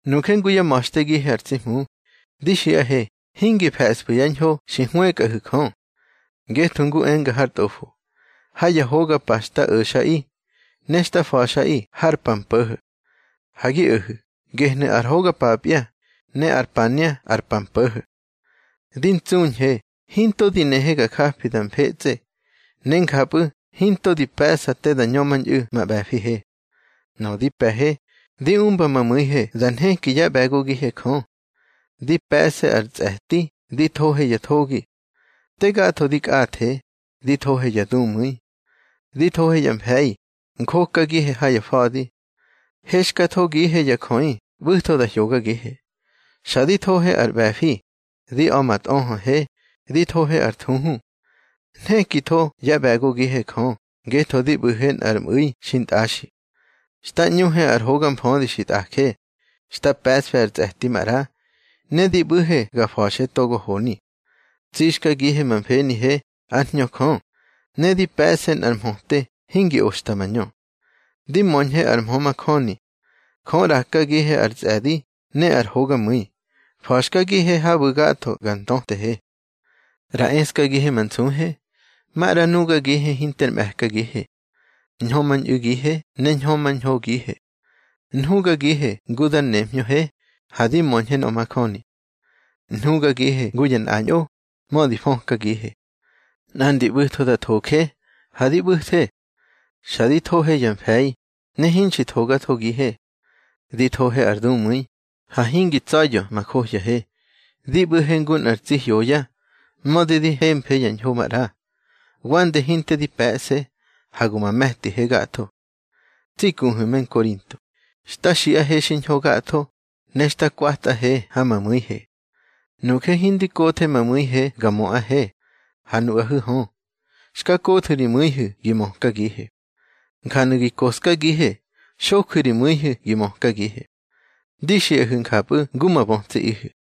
Nuje ngu yá ma̱xtegihe ar tsi Hmu, di xiꞌahe hingi fe̱sfu̱ ya ñho xi hwëkꞌahu̱ Jö. Ngetho ngu enga har Tꞌofo: Ha ya hoga pa xta o̱xꞌaꞌi, ne xta fa̱xꞌaꞌi har pa mpo̱ho̱. Ha gi o̱hu̱, gehnu̱ ar hoga papya, ne ar pania ar pa mpo̱ho̱. Di ntsuñhe hinto di nehe ga jafe da mfetsꞌe, ne njapꞌu̱ hinto di pe̱ꞌsa te da ñömañꞌu̱ ma ꞌbe̱fihe. Nöꞌö di pe̱he, di umba ma mu̱ihe da nheki yá ꞌbe̱gogihe Jö. Di pe̱ꞌse ar tsꞌe̱ti di thohe ya thogi. Te gatho di kꞌathe, di thohe ya dumu̱i. Di thohe ya mfe̱i, njokagihe ha ya fa̱di. Hexkathogihe ya jöꞌi ꞌbu̱tho da hyogagihe. Xa di thohe ar ꞌbe̱fi, di a̱ ma tꞌöhöhe, di thohe ar thuhu. Nhekitho yá ꞌbe̱gogihe Jö ngetho di ꞌbu̱he nꞌar mꞌu̱i xintꞌaxi. Xta ꞌñuhe ar hoga mfödi xi tꞌaje, xta pe̱ꞌsfe ar tsꞌe̱ti maꞌra, ne di ꞌbu̱he ga fa̱xe togo honi. Tsixkagihe ma mfenihe ár Hñö Jö, ne di pe̱ꞌse nꞌar mhöte hingi oxta mañö. Di möñhe ar mhö majöni. Jö ꞌrakagihe ar tsꞌe̱di ne ar hogamu̱i, fa̱xkagihe habu̱ gatho ga ntötehe. ꞌRa eskagihe ma nsuhe, maꞌra nugagihe hinter mꞌe̱kagihe. Ñhömañꞌu̱gihe ne ñhömañhogihe. Nhugagihe ngu dar nemhñöhe, ha di möñhe nöꞌö majöni. Nhugagihe ngu ya nꞌañꞌo, mödi fökagihe. Nꞌandi ya ꞌbu̱tho da thoje, ha di ꞌbu̱the. Xa di thohe ya mfe̱i, ne hinxi thogathogihe. Di thohe ar dumu̱i, ha hingi tsa̱ya̱ ma johyahe. Di ꞌbu̱he ngu nꞌar tsi hyoya, mödi di hemfe ya ñho maꞌra. Wande hinte di pe̱ꞌse, ha go ma me̱tihe gatho. Tsi kuhu̱ me Nkorinto, xta xiꞌahe xiñho gatho, ne xta kwatꞌahe ha ma mu̱ihe. Nuje hindi kothe ma mu̱ihe ga möꞌahe, ha nuꞌahu̱ hö, xka kothu̱ ri mu̱ihu̱ gi mökagihe. Njanu̱ gi koꞌskagihe, xoju̱ ri mu̱ihu̱ gi mökagihe. Di xiꞌahu̱ njapꞌu̱ ngu ma bötsiꞌihu̱.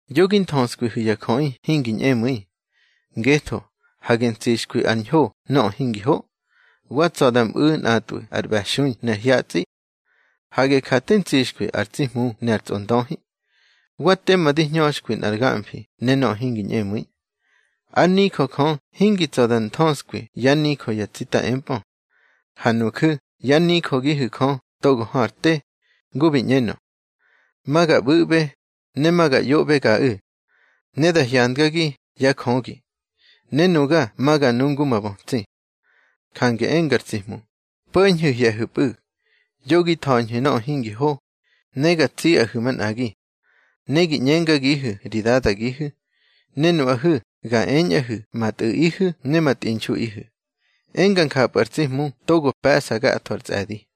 Yo gi nthöskwihu̱ ya jöꞌi hingi ñꞌemu̱i. Ngetho, hage ntsixkwi ar ñho nöꞌö hingi ho. Wa tsa̱ da mꞌu̱ nꞌatꞌwu̱ ar ꞌbe̱xui ne ar hyatsꞌi. Hage ja te ntsixkwi ar tsi Hmu ne ar tsꞌondöhi. Wa tema di hñöxkwi nꞌar gamfi ne nöꞌö hingi ñꞌemu̱i. Ár nijö Jö hingi tsa̱ da nthöskwi yá nijö ya tsita empꞌö. Ha nuju̱ yá nijögihu̱ Jö togo hö ar te. Ngu bi ꞌñenö: Ma ga ꞌbu̱ꞌbe, ne ma ga ꞌyoꞌbegaꞌu̱. Ne da hyandgagi yá Jögi, ne nuga ma ga nu ngu ma bötsi. Jange enga ar tsi Hmu: Po̱ñhu̱ hye̱hu̱pꞌu̱, yo gi tha̱ñhu̱ nöꞌö hingi ho, ne ga tsiꞌahu̱ manꞌagi. Ne gi ꞌñengagihu̱ ri Dadagihu̱, ne nuꞌahu̱ ga eñꞌahu̱ ma tꞌu̱ꞌihu̱ ne ma tꞌinxuꞌihu̱, enga njapꞌu̱ ar tsi Hmu togo pe̱ꞌsa gatho ar tsꞌe̱di.